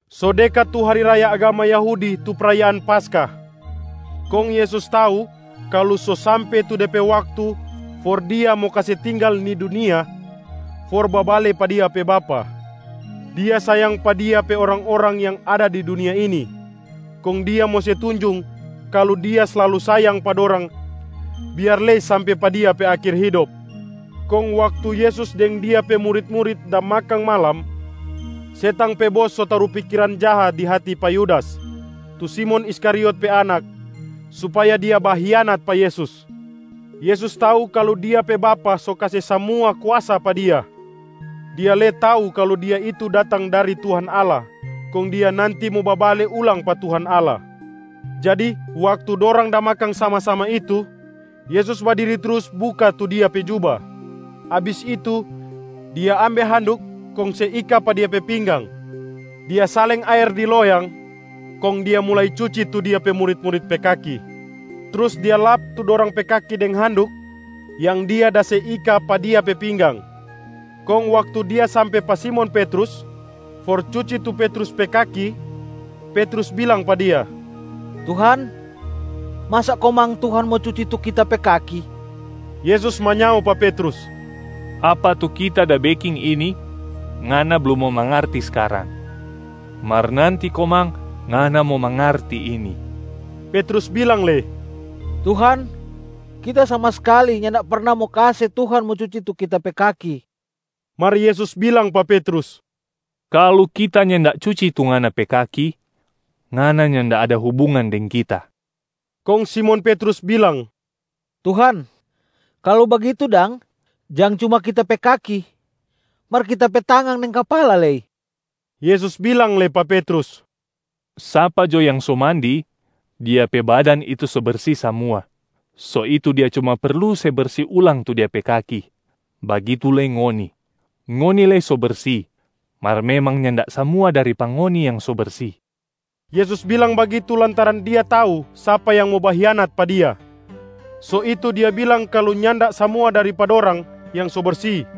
So dekat tu hari raya agama Yahudi tu prayaan Paskah, kong Yesus tau kalu so sampe tu de pe waktu for Dia mo kase tinggal ni dunia for babale pa Dia pe Bapa. Dia sayang pa Dia pe orang-orang yang ada di dunia ini, kong Dia mo se tunjung kalu Dia slalu sayang pa dorang biar lei sampe pa Dia pe akhir hidop. Kong waktu Yesus deng Dia pe murit-murit da makang malam, setang pe bos so taru pikiran jaha di hati pa Yudas tu Simon Iskariot pe anak, supaya dia bahianat pa Yesus. Yesus tau kalu Dia pe Bapa so kase samua kuasa pa Dia. Dia lei tau kalu Dia itu datang dari Tuhan Allah kong Dia nanti mo babale ulang pa Tuhan Allah. Jadi waktu dorang da makang sama-sama itu, Yesus badiri trus buka tu Dia pe juba. Abis itu, Dia ambe handuk kong se ika pa Dia pe pinggang. Dia saleng aer di loyang, kong Dia mulai cuci tu Dia pe murit-murit pe kaki, trus Dia lap tu dorang pe kaki deng handuk yang Dia da se ika pa Dia pe pinggang. Kong waktu Dia sampe pa Simon Petrus for cuci tu Petrus pe kaki, Petrus bilang pa Dia, “Tuhan, masa komang Tuhan mo cuci tu kita pe kaki?” Yesus manyao pa Petrus, “Apa tu Kita da beking ini, ngana blum mo mangarti skarang, mar nanti komang ngana mo mangarti ini.” Petrus bilang lei, “Tuhan, kita sama skali nyanda perna mo kase Tuhan mo cuci tu kita pe kaki.” Mar Yesus bilang pa Petrus, “Kalu Kita nyanda cuci tu ngana pe kaki, ngana nyanda ada hubungan deng Kita.” Kong Simon Petrus bilang, “Tuhan, kalu bagitu dang, jang cuma kita pe kaki, mar kita pe tangan deng kapala lei.” Yesus bilang lei pa Petrus, “Sapa jo yang so mandi, dia pe badan itu so bersi samua, so itu dia cuma perlu se bersi ulang tu dia pe kaki. Bagitu lei ngoni, ngoni lei so bersi, mar memang nyanda samua dari pa ngoni yang so bersi.” Yesus bilang bagitu lantaran Dia tau sapa yang mo bahianat pa Dia, so itu Dia bilang kalu nyanda samua dari pa dorang yang so bersi.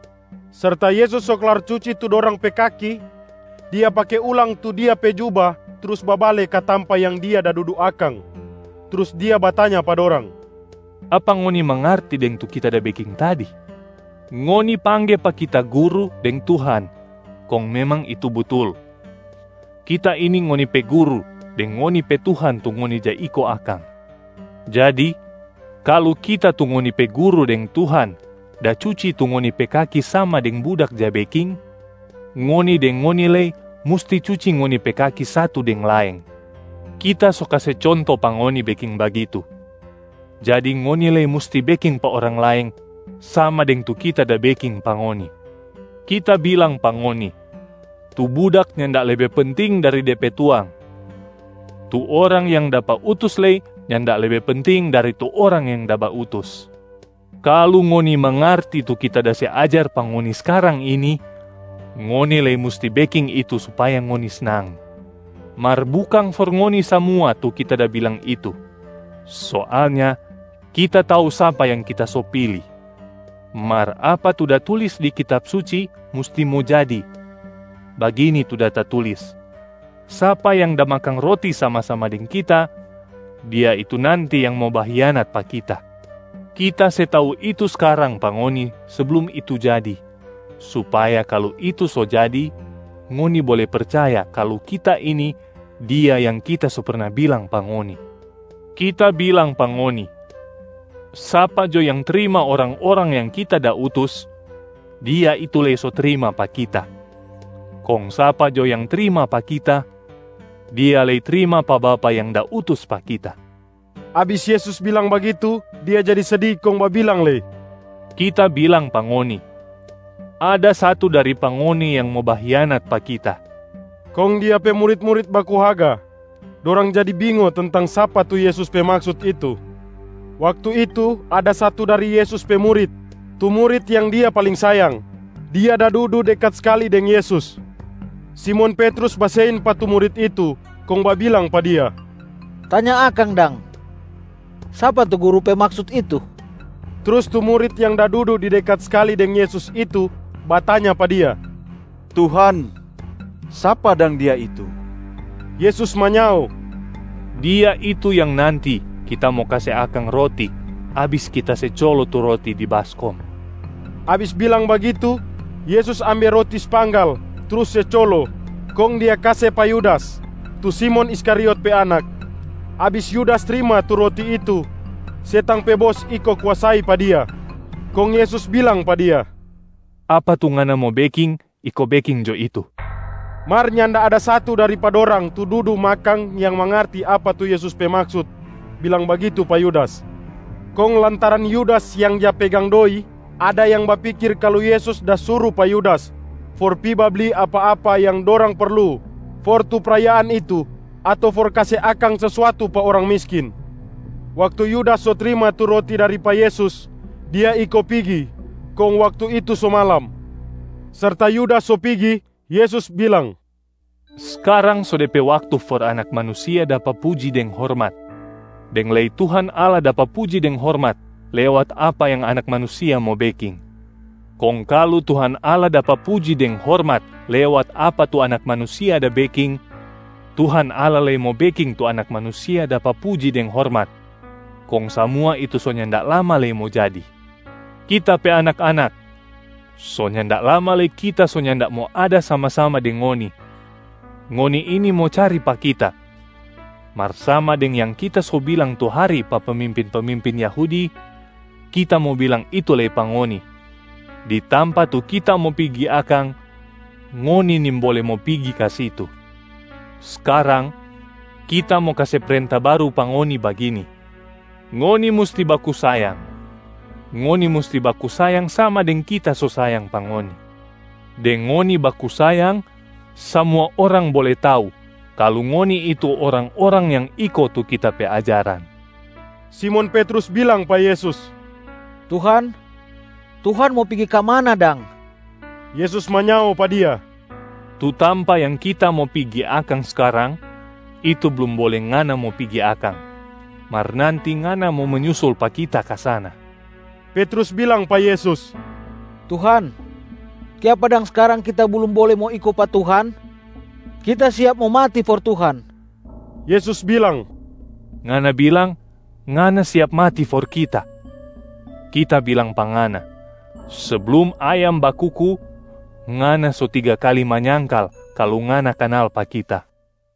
Serta Yesus so klar cuci tu dorang pe kaki, Dia pake ulang tu Dia pe juba trus babale ka tampa yang dia da dudu akang. Trus Dia batanya pa dorang, “Apa ngoni mangarti deng tu Kita da beking tadi? Ngoni pangge pa Kita ‘Guru’ deng ‘Tuhan’ kong memang itu butul. Kita ini ngoni pe Guru deng ngoni pe Tuhan tu ngoni ja iko akang. Jadi kalu Kita tu ngoni pe Guru deng Tuhan da cuci tu ngoni pe kaki sama deng budak ja beking, ngoni deng ngoni lei musti cuci ngoni pe kaki satu deng laeng. Kita so kase conto pa ngoni beking bagitu, jadi ngoni lei musti beking pa orang laeng sama deng tu Kita da beking pa ngoni. Kita bilang pa ngoni, tu budak nyanda lebe penting dari de pe tuang, tu orang yang dapa utus lei nyanda lebe penting dari tu orang yang da bautus. Kalu ngoni mangarti tu Kita da se ajar pa ngoni skarang ini, ngoni lei musti beking itu supaya ngoni snang. Mar bukang for ngoni samua tu Kita da bilang itu. Soalnya Kita tau sapa yang Kita so pili. Mar apa tu da tulis di Kitab Suci musti mo jadi, bagini tu da tatulis, ‘Sapa yang da makang roti sama-sama deng Kita, dia itu nanti yang mo bahianat pa Kita.’ Kita se tau itu skarang pa ngoni seblum itu jadi, supaya kalu itu so jadi, ngoni bole percaya kalu ‘Kita ini’ Dia yang Kita so perna bilang pa ngoni. Kita bilang pa ngoni, sapa jo yang trima orang-orang yang Kita da utus, dia itu lei so trima pa Kita. Kong sapa jo yang trima pa Kita, dia lei trima pa Bapa yang da utus pa Kita.” Abis Yesus bilang bagitu, Dia jadi sedi kong babilang lei, “Kita bilang pa ngoni, ada satu dari pa ngoni yang mo bahianat pa Kita.” Kong Dia pe murit-murit baku haga, dorang jadi bingo tentang sapa tu Yesus pe maksut itu. Waktu itu ada satu dari Yesus pe murit, tu murit yang Dia paling sayang, dia da dudu dekat skali deng Yesus. Simon Petrus basein pa tu murit itu kong babilang pa dia, “Tanya akang dang, sapa tu Guru pe maksut itu!” Trus tu murit yang da dudu di dekat skali deng Yesus itu batanya pa Dia, “Tuhan, sapa dang dia itu?” Yesus manyao, “Dia itu yang nanti Kita mo kase akang roti abis Kita se colo tu roti di baskom.” Abis bilang bagitu, Yesus ambe roti spanggal trus se colo, kong Dia kase pa Yudas, tu Simon Iskariot pe anak. Abis Yudas trima tu roti itu, setang pe bos iko kuasai pa dia. Kong Yesus bilang pa dia, “Apa tu ngana mo beking, iko beking jo itu.” Mar nyanda ada satu dari pa dorang tu dudu makang yang mangarti apa tu Yesus pe maksut bilang bagitu pa Yudas. Kong lantaran Yudas yang ja pegang doi, ada yang pikir kalu Yesus da suru pa Yudas for pi babli apa-apa yang dorang perlu for tu prayaan itu ato for kase akang sesuatu pa orang miskin. Waktu Yudas so trima tu roti dari pa Yesus, dia iko pigi. Kong waktu itu so malam. Serta Yudas so pigi, Yesus bilang, “Skarang so de pe waktu for Anak Manusia dapa puji deng hormat, deng lei Tuhan Allah dapa puji deng hormat lewat apa yang Anak Manusia mo beking. Kong kalu Tuhan Allah dapa puji deng hormat lewat apa tu Anak Manusia da beking, Tuhan Allah lei mo beking tu Anak Manusia dapa puji deng hormat, kong samua itu so nyanda lama lei mo jadi. Kita pe anak-anak, so nyanda lama lei Kita so nyanda mo ada sama-sama deng ngoni. Ngoni ini mo cari pa Kita, mar sama deng yang Kita so bilang tu hari pa pemimpin-pemimpin Yahudi, Kita mo bilang itu lei pa ngoni, ‘Di tampa tu Kita mo pigi akang, ngoni nimbole mo pigi ka situ.’ Skarang, Kita mo kase prenta baru pa ngoni bagini: ngoni musti baku sayang. Ngoni musti baku sayang sama deng Kita so sayang pa ngoni. Deng ngoni baku sayang, samua orang bole tau kalu ngoni itu orang-orang yang iko tu Kita pe ajaran.” Simon Petrus bilang pa Yesus, “Tuhan, Tuhan mo pigi ka mana dang?” Yesus manyao pa dia, “Tu tampa yang Kita mo pigi akang skarang, itu blum bole ngana mo pigi akang. Mar nanti ngana mo menyusul pa Kita ka sana.” Petrus bilang pa Yesus, “Tuhan, kiapa dang skarang kita blum bole mo iko pa Tuhan? Kita siap mo mati for Tuhan.” Yesus bilang, “Ngana bilang, ngana siap mati for Kita? Kita bilang pa ngana, seblum ayam bakuku, ngana so tiga kali manyangkal kalu ngana kanal pa Kita.”